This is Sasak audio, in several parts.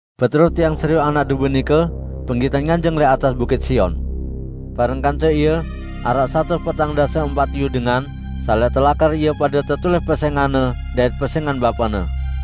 Beterus tiang serioq Anak Dombe nike penggitan nganjeng lẽq atas Bukit Sion. Bareng kance Ie araq satus petang dase empat iyu dengan saq lẽq telakar ie pade tetulis pesẽngan-Ne dait pesẽngan Bapa-Ne.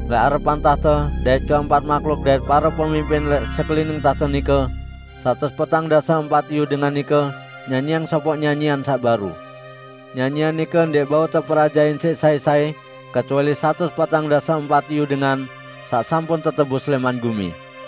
Lẽq arepan tahte dait keempat mahluk dait pare pemimpin lẽq sekelining tahte nike, satus petang dase empat iyu dengan nike nyanyiang sopoq nyanyian saq baru. Nyanyian nike ndẽq bau teperajahin siq sai-sai kecuali satus petang dase empat iyu dengan saq sampun tetebus lẽman gumi.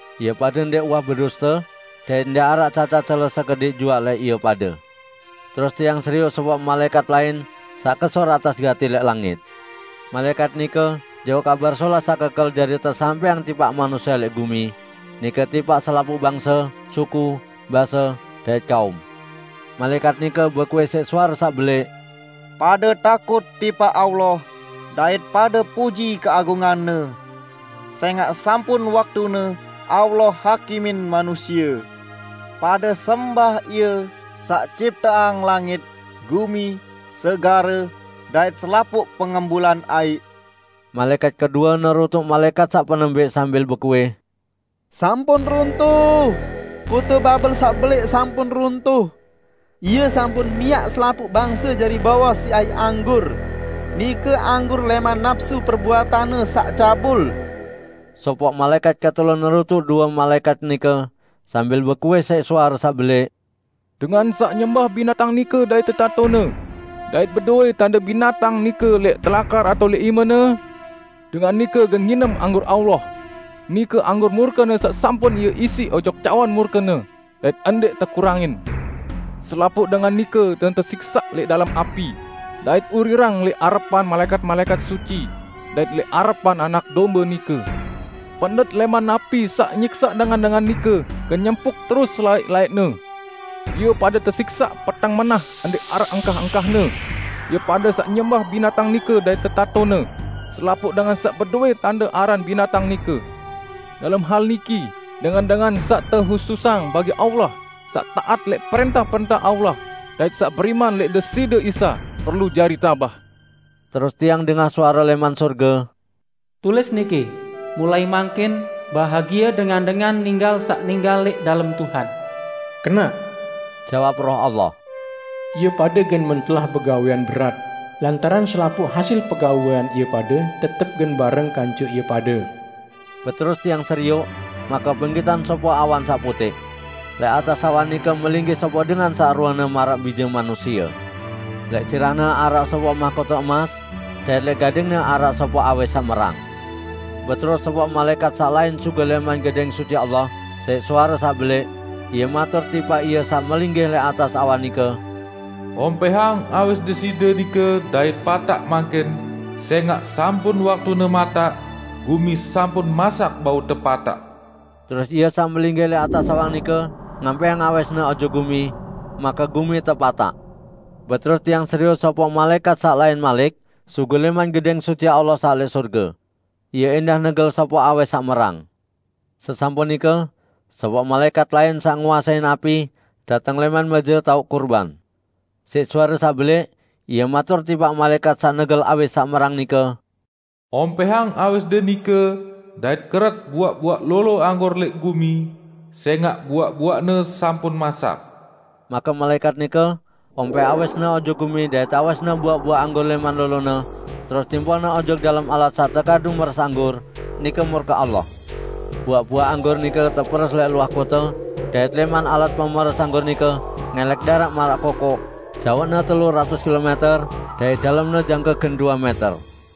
Ie pade ndẽq uwah beduste; dait ndẽq araq cacat cele sekediq juaq lẽq ie pade. Terus tiang serioq sopoq malaẽkat lain saq kesur atas gati lẽq langit. Malaẽkat nike jauq Kabar Solah saq kekel jari tesampẽang tipaq manusie lẽq gumi, nike tipaq selapuq bangse, suku, base, dait kaum. Malaẽkat nike bekuih siq suare saq belẽq, "Pade takut tipaq Allah, dait pade puji keagungan-Ne! Sẽngaq sampun waktune Allah hakimin manusie. Pade sembah Ie, saq cipteang langit, gumi, segare, dait selapuq pengembulan aiq!" Malaẽkat kedue nerutuk malaẽkat saq penembẽq sambil bekuih, "Sampun runtuh! Kote Babel saq belẽq sampun runtuh! Ie sampun miaq selapuq bangse jari bowos siq aiq anggur -- nike anggur lẽman napsu perbuatanne saq cabul!" Sopoq malaẽkat ketelu nerutuk due malaẽkat nike, sambil bekuih siq suare saq belẽq, "Dengan saq nyembah binatang nike dait tetatone, dait bedowẽ tande binatang nike lẽq telakar atao lẽq imene, dengan nike gen nginem anggur Allah, nike anggur murke-Ne saq sampun Ie isiq ojok cawan murke-Ne, dait ndẽq tekurangin! Selapuq dengan nike gen tesiksaq lẽq dalem api dait urirang lẽq arepan malaẽkat-malaẽkat suci dait lẽq arepan Anak Dombe nike. Pendet lẽman api saq nyiksaq dengan-dengan nike gen nyempuq terus selaẽq-laẽqne. Ie pade tesiksaq peteng menah ndẽq araq engkah-engkahne. Ie pade saq nyembah binatang nike dait tetatone, selapuq dengan saq bedowẽ tande aran binatang nike." Dalem hal niki dengan-dengan saq tehususang bagi Allah saq taat lẽq prẽntah-prẽntah Allah dait saq beriman lẽq Deside Isa, perlu jari tabah. Terus tiang dengah suare lẽman sorge, "Tulis niki: Mulai mangkin, bahagie dengan-dengan ninggal saq ninggal lẽq dalem Tuhan!" "Kenaq!" Jawab Roh Allah. "Ie pade gen mentelah begawẽan berat, lantaran selapuq hasil pegawẽan ie pade tetep gen bareng kance ie pade." Beterus tiang serioq, make penggitan sopoq awan saq putẽq. Lẽq atas awan nike melinggih sopoq dengan saq ruene maraq Bije Manusie. Lẽq sirah-Ne araq sopoq mahkote emas, dait lẽq gading-Ne araq sopoq awis saq merang. Beterus sopoq malaẽkat saq lain sugul lẽman Gedẽng Suci Allah, siq suare saq belẽq, ie matur tipaq Ie saq melinggih lẽq atas awan nike, "Ompẽhang awis Deside nike dait pataq mangkin, sẽngaq sampun waktune mataq; gumi sampun masak bau tepataq!" Terus Ie saq melinggih lẽq atas awan nike ngampẽhang awis-Ne ojok gumi, make gumi tepataq. Beterus tiang serioq sopoq malaẽkat saq lain malik sugul lẽman Gedẽng Suci Allah saq lẽq sorge. Ie ẽndah negel sopoq awis saq merang. Sesampun nike, sopoq malaẽkat lain, saq nguasein api, dateng lẽman mẽje taoq kurban. Siq suare saq belẽq ie matur tipaq malaẽkat saq negel awis saq merang nike, "Ompẽhang awisde nike dait keret buaq-buaq lolo anggur lẽq gumi, sẽngaq buaq-buaqne sampun masak!" Make malaẽkat nike ompẽh awisne ojok gumi dait awisne buaq-buaq anggur lẽman lolone, terus timpohne ojok dalem alat saq tekadu meres anggur, nike murke Allah. Buaq-buaq anggur nike teperes lẽq luah kote, dait lẽman alat pemeres anggur nike ngẽlẽk daraq maraq kokoq, jaoqne telu ratus kilomẽter, dait dalemne jangke gen due mẽter.